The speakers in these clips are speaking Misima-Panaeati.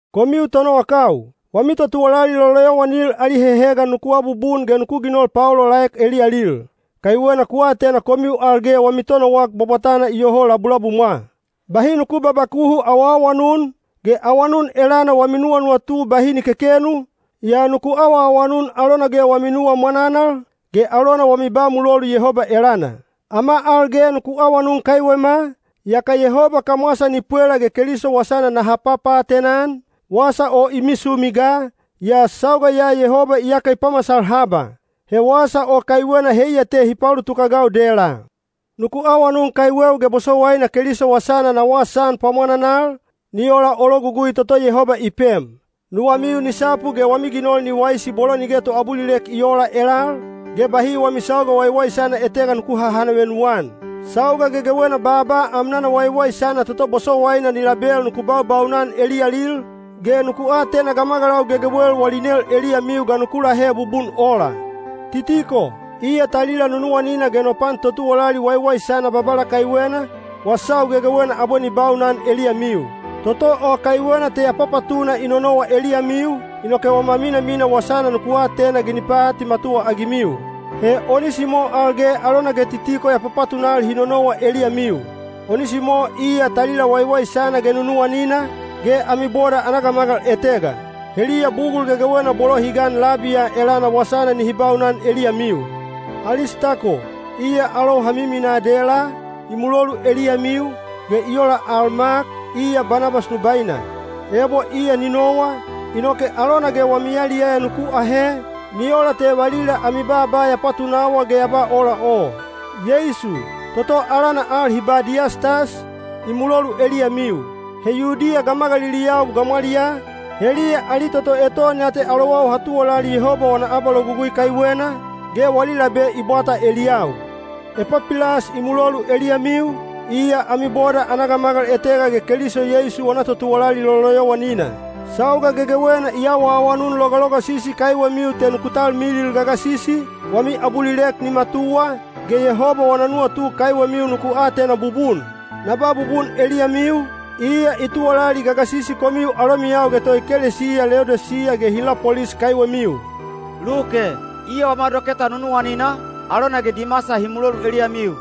Komiu tonowakau, wami totuwalali loloyowanil ali hehegan nuku abubun ge nuku ginol paolaolaek eliyalil, kaiwena ku atena komiu al ge wami Tonowak Bwabwatana iyoho labulabumwa. Bahi nuku babakuhu awaawanun, ge awanun elana wami nuwanuwatu bahi ni kekenu, yaa nuku awaawanun alona ge wami nuwa mwananal, ge alona wami ba mulolu Yehoba elana. Ama al ge nuku awanun kaiwema, yaka Yehoba kamwasa ni pwela ge Keliso wasana naha papaatena-an, wasa o i misumi ga, yaa sauga ya Yehoba iyaka i pamasal haba. He wasa o kaiwena heiya te hi paulutuk-agau dela. Nuku awanun kaiweu ge bosowaina Keliso wasana na wasaan pwamwananal, ni ola o logugui toto Yehoba i pem. Nuwamiu ni sapu ge wami ginol ni waisi bolo nige toabulilek i oola elal, ge bahi wami sauga waiwaisana etega nuku hahanavenu-an. Sauga gegewena baaba amnana waiwaisana toto bosowaina ni label nuku baubaunan eliyalil, ge nuku atena gamagalau gegewel wali nel eliyamiu ga nuku lahe bubun ola. Titiko, iya talila nunuwanina ge no pan totuwalali waiwaisana Babala kaiwena, wasau gegewena abwe ni baunan eliyamiu. Toto o kaiwena te ya papatuna i nonowa eliyamiu, inoke wama minamina wasana nuku atena ge ni paatimatuwa-agimiu. He Onisimo al ge alona ge Titiko ya papatunal hi nonowa eliyamiu. Onisimo iya talila waiwaisana ge nunuwanina, ge ami boda ana gamagal etega. Heliya bugul gegewena bolo hi gan labi ya elana wasana nihi baunan eliyamiu. Alistako, iya alou ha minamina dela, i mulolu eliyamiu, ge i ola al Mak, iya Banabas nubaina. (Ebo iya ni nowa, inoke alona ge wami yaliyaya nuku ahe, ni ola te valila ami baaba ya patunawa ge ya ba ola o.) Yeisu, toto alana al hi ba Diyastas, i mulolu eliyamiu. He Yudiya gamagaliliyau gamwaliyaa, heliya ali toto eton ya te alowau ha tuwalali Yehoba wana abalogugui kaiwena, ge wali labe i bwata eliyau. Epapilas i mulolu eliyamiu, iya ami boda ana gamagal etega ge Keliso Yeisu wana totuwalali loloyowanina. Sauga gegewena i awaawanun logalogasisi kaiwemiu te nuku talmilil gagasisi, wami abulilek ni matuwa, ge Yehoba wana nuwatu kaiwemiu nuku atena bubun. Na ba bubun eliyamiu, iya i tuwalali gagasisi komiu alomiyau ge toekelesiya Leodisiya ge Hilapolis kaiwemiu. Luke, iya wama doketa nunuwanina, alona ge Dimasa hi mulolu eliyamiu.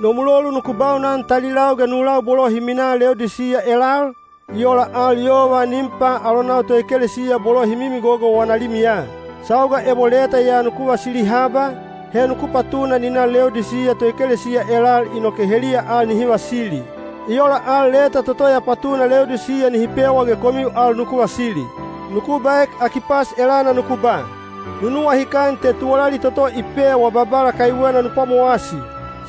No mulolu nuku baunan talilau ge nulau bolo hi minaa Leodisiya elal, i ola al yova Nimpa alonau toekelesiya bolo hi mimigogo wana limiya. Sauga ebo leta ya nuku vasili haba, he nuku patuna ni na Leodisiya toekelesiya elal inoke heliya al nihi vasili. I ola al leta toto ya patuna Leodisiya nihi pewa ge komiu al nuku vasili. Nuku baek Akipas elana nuku ba, “Nu nuwahikan te tuwalali toto hi pewa Babala kaiwena nu pwamowasi.”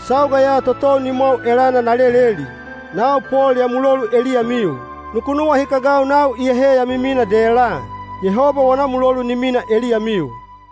Sauga ya totou nimwau elana na leleli. Nau Pol ya mulolu eliyamiu. Nuku nuwahikagau nau iyahe ya miminaa dela. Yehoba wana mulolu ni mina eliyamiu.